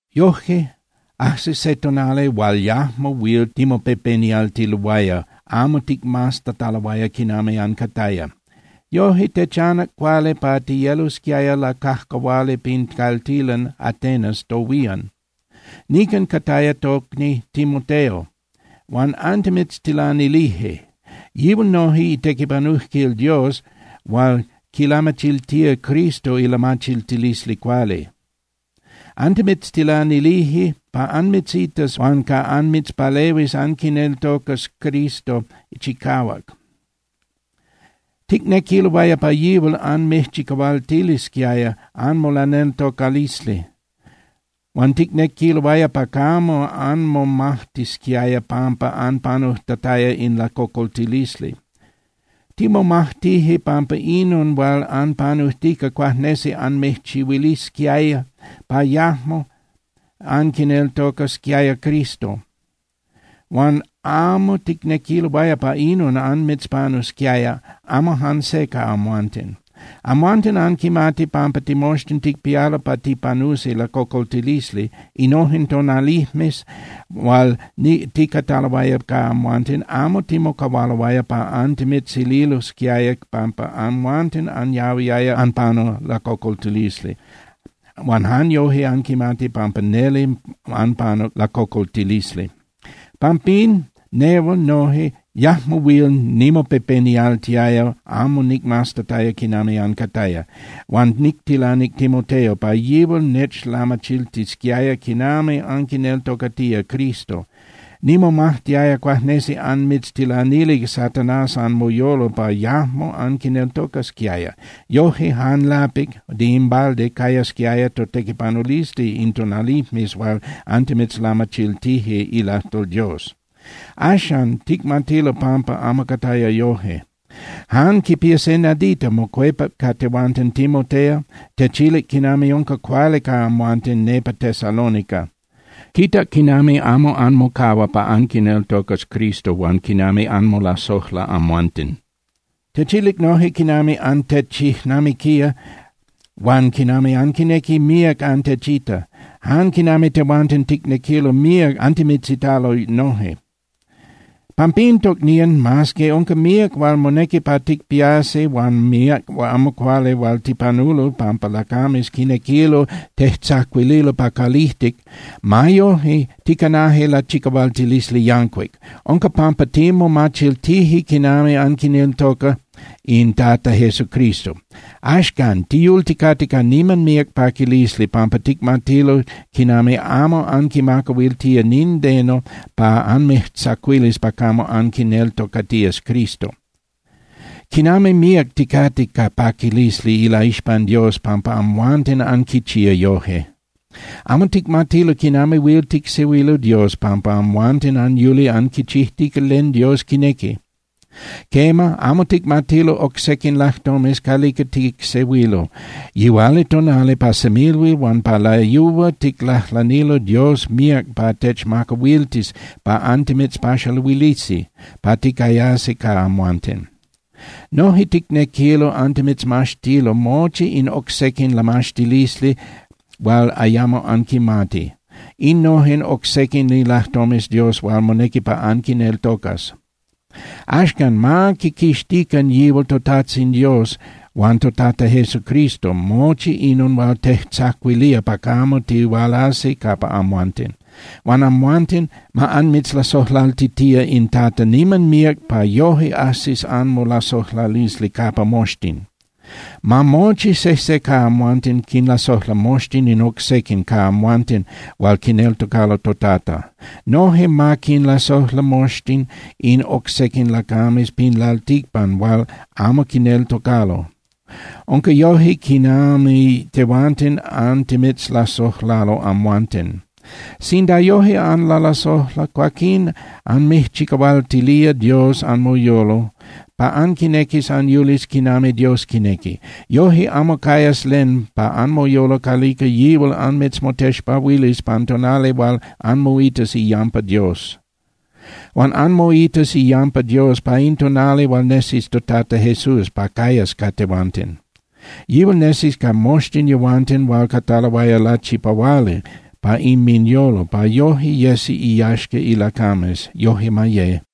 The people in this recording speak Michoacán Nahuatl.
Yojque, ajsic se tonali hual yajmo huil timopepenialtiloaya amo ticmaztataloaya quinami ancataya. Yoje techanac cuali pa tiyelosquiaya lacajcahuali pin caltilan Atenas tohuían. Nican cataya tocni Timoteo, huan antimitztilanilije. Yihual noje itequipanujquil Dios hual quilamachiltía Cristo ilamachiltilisli cuali. Antimitztilanilije pa anmitzitas huan pa anmitzpalehuis anquineltocas Cristo chicahuac. Ticnequiloaya pa yihual anmijchicahualtilisquiaya anmolaneltocalisli huan ticnequiloaya pa camo anmomajtisquiaya pampa anpanujtataya in lacocoltilisli. Timomajtije pampa inon hual anpanujtica cuajnesi anmijchihuilisquiaya pa yajmo anquineltocasquiaya Cristo. Huan amo ticnequiloaya pa inon anmitzpanusquiaya amo jan se ca amhuanten. Amhuanten anquimati pampa timoxtin ticpialo pa tipanusi lacocoltilisli. Innojen tonalijmes hual ticataloaya ca amhuanten, amo timocahualoaya pa antimitzililosquiaya pampa amhuanten anyahuiaya anpanu lacocoltilisli huan jan yoje anquimati pampa neli anpanuc lacocoltilisli. Pampín nehual noje yajmo huil nimopepenialtiaya amo nicmaztataya quinami ancataya, huan nictilanic Timoteo pa yihual nechlamachiltisquiaya quinami anquineltocatía Cristo. Nimomajtiaya cuajnesi anmitztilanilic Satanás anmoyolo pa yajmo anquineltocasquiaya. Yoje jan lapic (de in balde) cayasquiaya totequipanulisli in tonalijmes hual antimitzlamachiltije ilajtol Dios. Axan, ticmatilo pampa amo cataya yoje. Jan quipía se nadita mocuepac ca tehuanten Timoteo, techilic quinami unca cuali ca amhuanten nepa Tesalónica. Quitac quinami amo anmocahua pa anquineltocas Cristo huan quinami anmolasojla amhuanten. Techilic noje quinami antechijnamiquía huan quinami anquinequi míac antechita, jan quinami tehuanten ticnequilo míac antimitzitalo noje. Pampín, tocnían, mas que unca míac hual monequi pa ticpiasi huan míac amo cuali hual tipanulo pampa lacames quinequilo tejtzacuililo pa calijtic, ma yoje ticanaje lachicahualtilisli yancuic. Unca pampa timomachiltije quinami anquineltoca in Tata Jesucristo. Axcan tiyulticate ca niman míac paquilisli pampa ticmatilo quinami amo anquimacahuiltía nindeno pa anmijtzacuilis pa camo anquineltocatías Cristo. ¡Quinami míac ticate ca paquilisli ilaixpan Dios pampa amhuanten anquichía yoje! Amo ticmatilo quinami huil ticsehuilo Dios pampa amhuanten anyuli anquichijtica len Dios quinequi. Quema, amo ticmatilo oc sequin lajtomes calica ticsehuilo. Yihualitonali, pa semilhuil huan pa layúa ticlajlanilo Dios míac pa techmacahuiltis pa antimitzpaxaluilisi pa ticayasi ca amhuanten. Noje ticnequilo antimitzmaxtilo mochi in oc sequin lamaxtilisli hual ayamo anquimati, innojen oc sequin ilajtomes Dios hual monequi pa anquineltocas. Axcan, ma quiquixtican yihual toTajtzin Dios huan toTata Jesucristo mochi inon hual tejtzacuilía pa camo tihualasi capa amhuanten. Huan amhuanten, ma anmitzlasojlaltitía in Tata niman míac pa yoje ajsis anmolasojlalisli capa moxtin. Ma mochi sejse ca amhuanten quinlasojla moxtin in oc sequin ca amhuanten hual quineltocalo toTata. Noje ma quinlasojla moxtin in oc sequin lacames pin lalticpan hual amo quineltocalo. Unca yoje quinami tehuanten antimitzlasojlalo amhuanten. Sinda yoje anlalasojla, cuaquín anmijchicahualtilía Dios anmoyolo pa anquinequis anyulis quinami Dios quinequi. Yoje amo cayas len pa anmoyolo calica yihual anmitzmotexpahuilis pan tonali hual anmoitas iyampa Dios. Huan anmoitas iyampa Dios pa in tonali hual nesis toTata Jesús pa cayas ca tehuanten. Yihual nesis ca moxtin yehuanten hual cataloaya lachipahuali pa inminyolo pa yoje yesi iyaxca ilacames. Yoje ma ye.